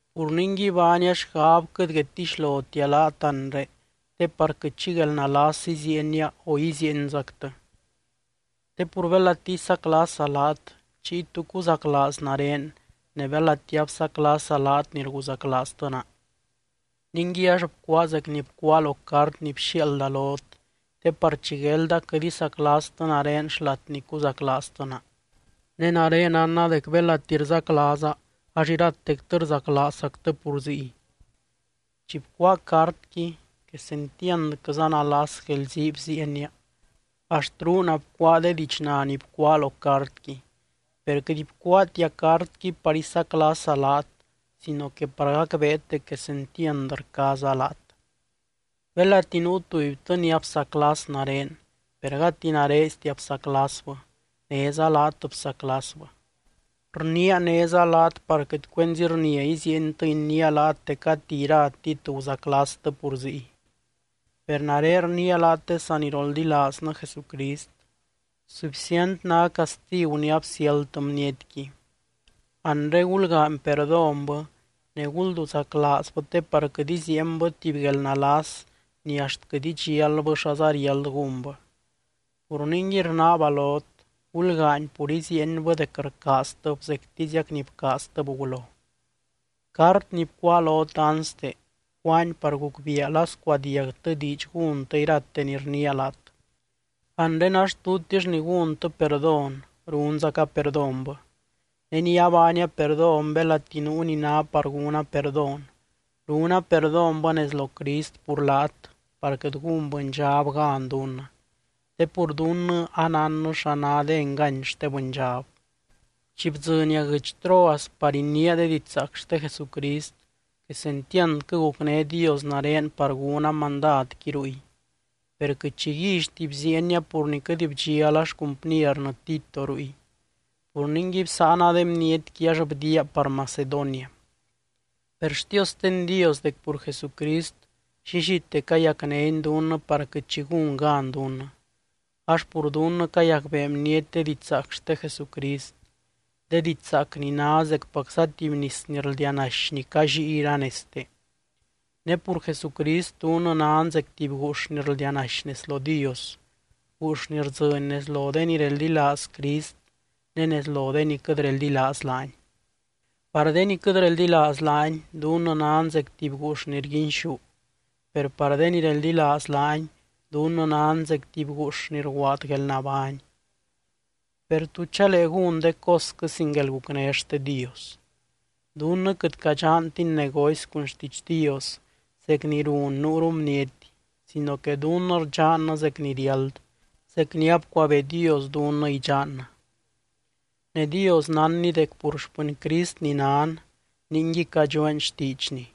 Pur ningui, baania xgab quɨt guedtixlotia laat anre, te par quɨt xi guelnalas iziienia o iziienzactɨ. Te pur belati isaclasa laat chiy, ¿tú cuzaclaaz nare ne belati absaclasa laat ni rguzaclaaztɨ naa? Ningui ax bcuáa zec ni bcuáa lo cart ni bxiaalda lot, te par chi guelda quɨt isaclastɨ nare xlat ni cuzaclaaztɨ naa. Ne nare nánna dec belati rzaclaaza ax iratectɨ rzaclaazzactɨ pur ziy. Chi bcuáa cartqui quesentiandquɨza nalas guelzii bziienia axt ruuna bcuáa de diidxna ni bcuáa lo cartqui, per quɨt bcuáatia cartqui par isaclasa laat sino que par gacbeet dec quesentiand rcaaza laat. Belati nuu tubytɨ ni absaclas nare, per gati narestia bsaclasbɨ néza laat bsaclasbɨ. Rniia néza laat par quɨt cuenzi rnia iziientɨ iniia laat dec gati iratit guzaclastɨ pur ziy. Per nare rniia laat de saniroldilaaznɨ Jesucrist: Sufcient ná castigu ni absiáldtɨ bnietqui. Anre gulgaany perdónbɨ ne gulduzaclaazbɨ te par quɨt iziienbɨ tuby guelnalas ni axt quɨt idxialbɨ xaza riáld gúnbɨ. Pur ningui rnaaba lot, gulgaany pur iziienbɨ dec rcaaztɨb zectiziac ni bcaaztɨb gulo. Cart ni bcuáa lot anste, bcuáani par gucbiia la scuadiagtɨ diidx gúntɨ irate ni rniia laat. Anre ax tutix ni gúntɨ perdón, runzaca perdónbɨ. Ne ni abaania perdón belati nuu ni ná par gúna perdón, runa perdónbɨ nez lo Crist pur laat par quɨt gún bɨndxab gan dunnɨ, te pur dunnɨ anánnɨ xa ná de engany xte bɨndxab. Chi bdzɨnia guɨdx Troas par iniia de didxzaac xte Jesucrist, quesentiandquɨ gucné Dios nare par gúna mandadqui ruy. Per quɨt xi guíllyti bziienia pur ni quɨt bdxiala xcumpniernɨ Tito ruy. Pur ningui bsáana de bnietqui ax bdiaa par Macedonia. Per xtiosten Dios dec pur Jesucrist llillite cayacnény dunnɨ par quɨt xi gún gan dunnɨ, ax pur dunnɨ cayacbee bniety de didxzaac xte Jesucrist, de didxzaac ni ná zecpacza tuby nis ni rldianaxy ni callíi iranezte. Ne pur Jesucrist dunnɨ nan zec tuby guux ni rldianaxy nez lo Dios, guux ni rdzɨny nez lo de ni reldilaaz Crist ne nez lo de ni quɨt reldilaaz laany. Par de ni quɨt reldilaaz laany, dunnɨ nan zec tuby guux ni rguinxú, per par de ni reldilaaz laany, dunnɨ nan zec tuby guux ni rguaad guelnabány. Per, ¿tú chalee gún de cosquɨ sin guelgucné xte Dios? Dunnɨ quɨt cadxantin negocy cun xtiidx Dios zec ni run nuuru bniety sino que dunnɨ rdxannɨ zec ni riáld, zec ni abcuabee Dios dunnɨ idxannɨ. Ne Dios nánny dec pur xpɨny Crist ni nan ningui cadxueen xtiidxny.